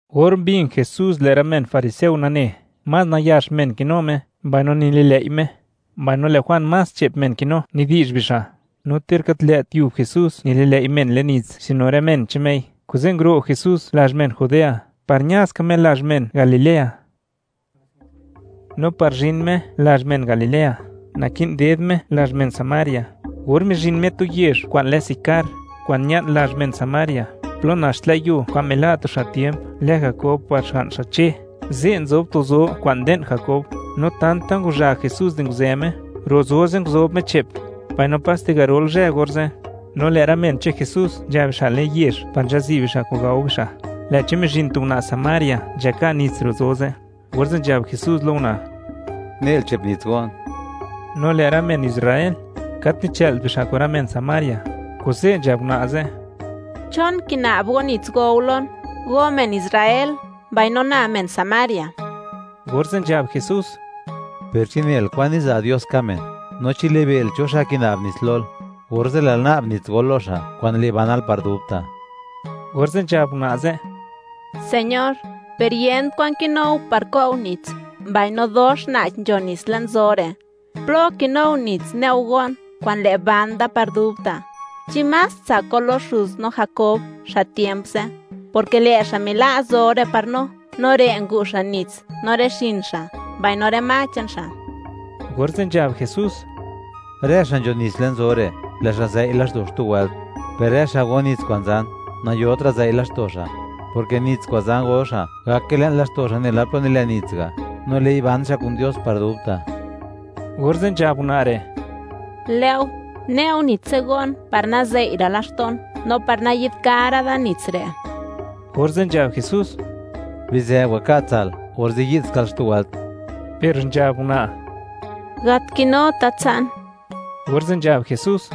Or mbin Jesús, lë' rë men fariseo nane, más nayax men kinu Me mbaino nililëi' Me, mbaino lë' Juan más che'p men kinu nidi'zh bixa', no ter gat lë't yub Jesús nililëi' men len nits sino rë men che'n Mei, kuze' nguro' Jesús lazh men Judea, par ña ska Me lazh men Galilea. No par zhin Me lazh men Galilea, naki'n ded Me lazh men Samaria. Or mizhin Me tu yezh kwa'n lë Sicar, kwa'n ña'n lazh men Samaria, plo nax tlë' yuo kwa'n mila' tu xa' tiemp lë Jakob par xga'n xa' Che, ze' nzob tu zo kwa'n nde'n Jakob. No tanta ngwazha Jesús di nguzë Me, ro' zo ze' nguzob Me che'p, mbaino paste garol zhë orze'. No lë' rë men che'n Jesús nzha bixa' le'n yezh par nzhazi' bixa' kwa'n gao bixa'. Lë'chi mizhin tu una' Samaria nzhaka' nits ro' zo ze', orze' nzhab Jesús lo una': ―Ne'l che'p nits go'n. No lë' rë men Israel gat nichë'lt bixa' kun rë men Samaria, kuze' nzhab una' ze': ―¿Chon kina'b go nits go go lon, go men Israel, mbaino na men Samaria? Orze' nzhab Jesús: ―Per chi nel kwan niza' Dios ka' men, no chi libe'l cho xa' kina'b nits lol, orze' lë'l na'b nits gol lo xa', kwa'n le' banal par dubta'. Orze' nzhab una' ze': ―Señor, per yent kwan kinou par ko'u nits, mbaino dox na'ch nzho nits le'n zo re'; ¿plo kinuo nits ne'u go'n kwa'n le', ban da par dubta'? ¿Chi más tsak go lo xuz no Jakob xa' tiemp ze'? Porke lë' xa' mila' zo re' par no, no re' ngu' xa' nits no rë xin xa', mbaino rë ma che'n xa'. Orze' nzhab Jesús: ―Rë xa' nzho nits le'n zo re', lë' xa' zëi' laxto' xtu wëlt, per rë xa' go nits kwa'n zan, nayotra' zëi' laxto' xa', porke nits kwa'n zan go xa', gake le'n laxto' xa' nela plo nilen nits ga', no le'i ban xa' kun Dios par dubta'. Orze' nzhab una' re': ―Lë' go, ne'u nits ze' go'n par nazëi'ra' laxto'n, no par nayi'dkara' da nits re'. Orze' nzhab Jesús: ―Bizë, waka' tsa'l, orze' yi'dskal xtu wëlt. Per nzhab una': ―Gat kinuta tsa'n. Orze' nzhab Jesús: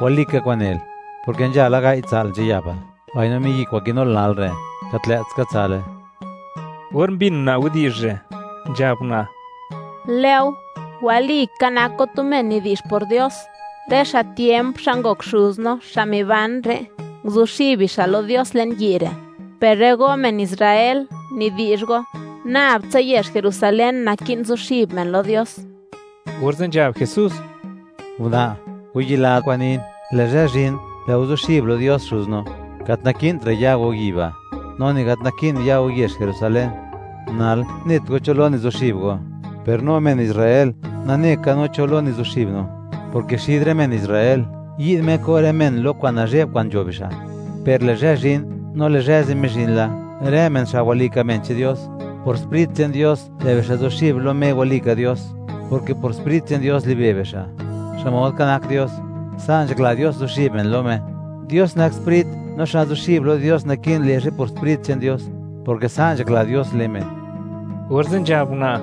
―Walika kwa'n nel, porke nzha la gai' tsa'l nzhayapal, mbaino miyi' kwa'n kinul nal re', gat lë't ska tsa'le. Or mbin una' widi'zh re', nzhab una': ―Lë' go, walika nak go tu men nidi'zh por Dios. Rë xa' tiemp, xa' ngok xuz no, xa' miban re', nguzuxib bixa' lo Dios le'n yi' re'; per rë go men Israel, nidi'zh go, nab tsa yezh Jerusalén naki'n zuxib men lo Dios. Orze' nzhab Jesús: Una', wayila kwa'n nin; lë' zhë zhin, lë' go zuxib lo Dios Xuz no, gat naki'ntra' ya go yi' ba', no ni gat naki'n ya go yezh Jerusalén. Nal, net go cho lo nizuxib go; per no men Israel, nane ka no cho lo nizuxib no, porke xid rë men Israel yi'd Me ko' rë men lo kwa'n nazhe'b kwa'n nzho bixa'. Per lë' zhë zhin, no lë' zhë ze' mizhin la, rë men xa' walika men che'n Dios, por Sprit che'n Dios lë' bixa' zuxib lo Me walika Dios; porke por Sprit che'n Dios libe' bixa', xmod ka nak Dios. Sa' nzhakla Dios zuxib men lo Me. Dios nak sprit, no xa' zuxib lo Dios naki'n le' xa'i por Sprit che'n Dios, porke sa' nzhakla Dios le' men. Orze' nzhab una':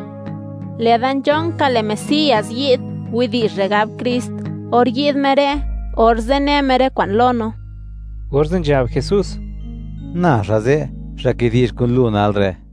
―Lë'da nzhonka lë' Mesías yi'd, widi'zh re' gab Krist; or yi'd Me re', orze' ne Me rë kwa'n lo no. Orze' nzhab Jesús: ―Na xa' ze', xa' kidi'zh kun lu nal re'.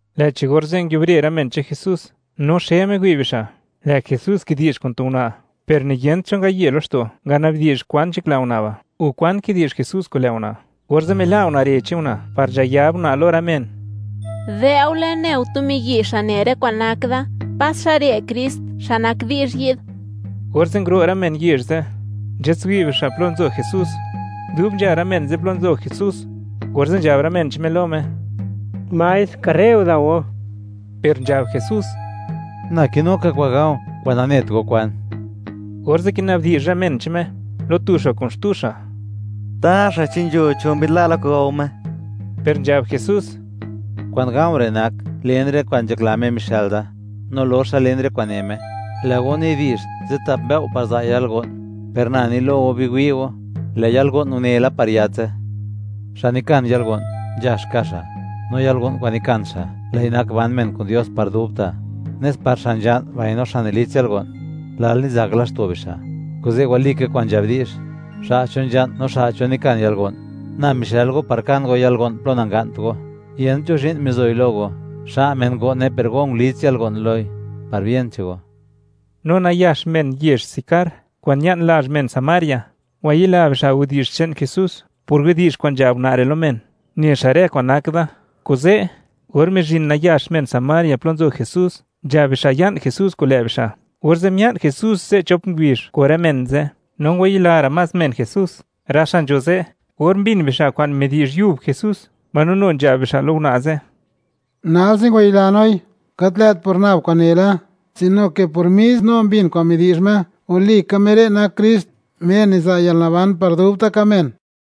Lë'chi orze' nguiubre rë men che'n Jesús, no xe miwi' bixa', lë' Jesús kidi'zh kun tu una', per ni yent cho ngaye laxto' ngana'bdi'zh kwan nzhakla una' ba' o kwan kidi'zh Jesús kun lë' una', orze' mila' una' ree che'n una' par nzhayab una' lo rë men: ―¡Dë'ule, ne go tu miyi', xa' ne rë kwa'n nak da! ¿Pas xa' re' Krist, xa' nak di'zh yi'd? Orze' nguro' rë men yezh ze', nzhatswi' bixa' plo nzo Jesús. Dub nzha rë men ze' plo nzo Jesús, orze' nzhab rë men che'n Me lo Me: ―Maestr, dao go nal. Per nzhab Jesús: ―Na kinu ka kwa'n ga̱u̱, kwa'n nanet go kwan. Orze' kina'bdi'zh rë men che'n Me lo tu xa' kun xtu xa': ―Taxa, ¿chi nzho cho mbi'dla' la kwa'n gao Me? Per nzhab Jesús: ―Kwa'n ga̱u̱ re' nak, len rë kwa'n nzhakla Me mixë'l da, no loxa len rë kwa'n ne Me. Lë' go nidi'zh, zitap mbëo' par za' yalgo'n; per na ni lo go, biwi' go, lë' yalgo'n une la par yatse. Xa' nikan yalgo'n, nzhax ka' xa'; no yalgo'n kwa'n nikan xa', lë'i nak ban men kun Dios par dubta', nes par xa' nzha'n mbaino xa' nilits yalgo'n, lal nizak laxto' bixa'. Kuze' walika kwa'n nzhab di'zh: “Xa' cho nzha'n no xa' cho nikan yalgo'n.” Na mixël go par kan go yalgo'n plo nanga'nt go, yent cho zhi'n mizoi lo go; xa' men ngo'ne per go ngulits yalgo'n loi, par bien che'n go. No nayax men yezh Sicar, kwa'n ña'n lazh men Samaria, ngwayila bixa' widi'zh che'n Jesús por widi'zh kwa'n nzhab una' re' lo men: “Ne xa' rë kwan nak da.” Kuze', or mizhin nayax men Samaria plo nzo Jesús, nzhab bixa' ya'n Jesús kun lë' bixa', orze' mia'n Jesús ze' chop ngubizh kun rë men ze', no ngwayila ra' más men Jesús, rë xa' nzho ze', or mbin bixa' kwa'n midi'zh yub Jesús, mbaino nu nzhab bixa' lo una' ze': ―Nalse ngwayila noi, gat lë't por nab kwa'n nele, sino ke por mis no mbin kwa'n midi'zh Me, walika Me re' nak Krist, Me niza' yalnaban par dubta' ka' men.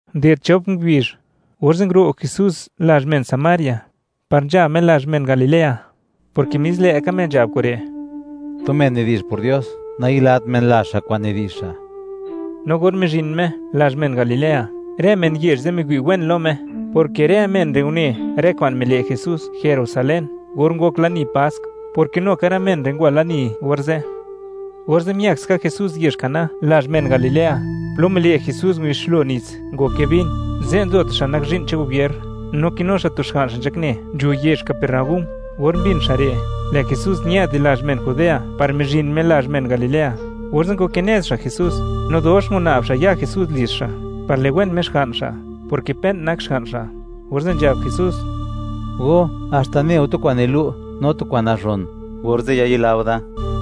Unded chop ngubizh, orze' nguro' Jesús lazh men Samaria par nzha Me lazh men Galilea, porke mis lë'ka Me nzhab kure': “Tu men nidi'zh por Dios, nayilat men lazh xa' kwa'n nidi'zh xa'.” No or mizhin Me lazh men Galilea, rë men yezh ze' miwi' wen lo Me, porke rë men re' une rë kwa'n mile' Jesús Jerusalén or ngok lani Pask, porke nu ka rë men re' ngwa lani orze'. Orze' miëk ska Jesús yezh Caná lazh men Galilea, plo mile' Jesús ngubixlo nits, ngoke vin, ze' nzo tu xa' nak zhi'n che'n gobier, no kinu xa' tu xga'n xa' nzhakne nzho yezh Capernaúm. Or mbin xa' re', lë' Jesús ñë'd di lazh men Judea par mizhin Me lazh men Galilea, orze' ngwakinez xa' Jesús, no dox una'b xa' ya Jesús lizh xa', par liwen Me xga'n xa', porke pe'n nak xga'n xa'. Orze' nzhab Jesús: ―Go haxta neu tu kwa'n nilu' no tu kwa'n nazhon, orze' yayilao da.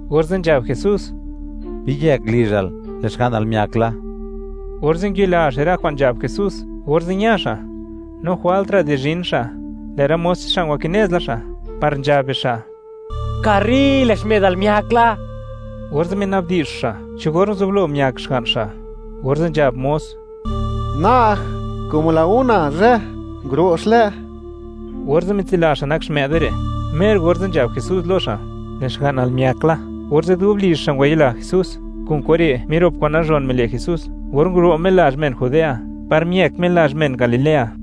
Orze' nzhab Jesús: ―Biyëk lizhal, lë' xga'nal miak la. Orze' ngwayila xa' re' kwa'n nzhab Jesús, orze' ña xa', no jwaltra' di zhin xa', lë' rë mos che'n xa' ngwakinez la xa' par nzhab bixa': ―¡Karri! ¡Lë' xmë'dal miak la! Orze' mina'bdi'zh xa', cho or nguzublo miak xga'n xa', orze' nzhab mos: ―Na'g, como la una zhë, nguro' xlë'. Orze' mitsila xa' nak xmë'de re', mer orze' nzhab Jesús lo xa': “Lë' xga'nal miak la”, orze' dub lizh xa' ngwayila Jesús. Kun kure' mirop kwa'n nazhon mile' Jesús, or nguro' Me lazh men Judea, par miëk Me lazh men Galilea.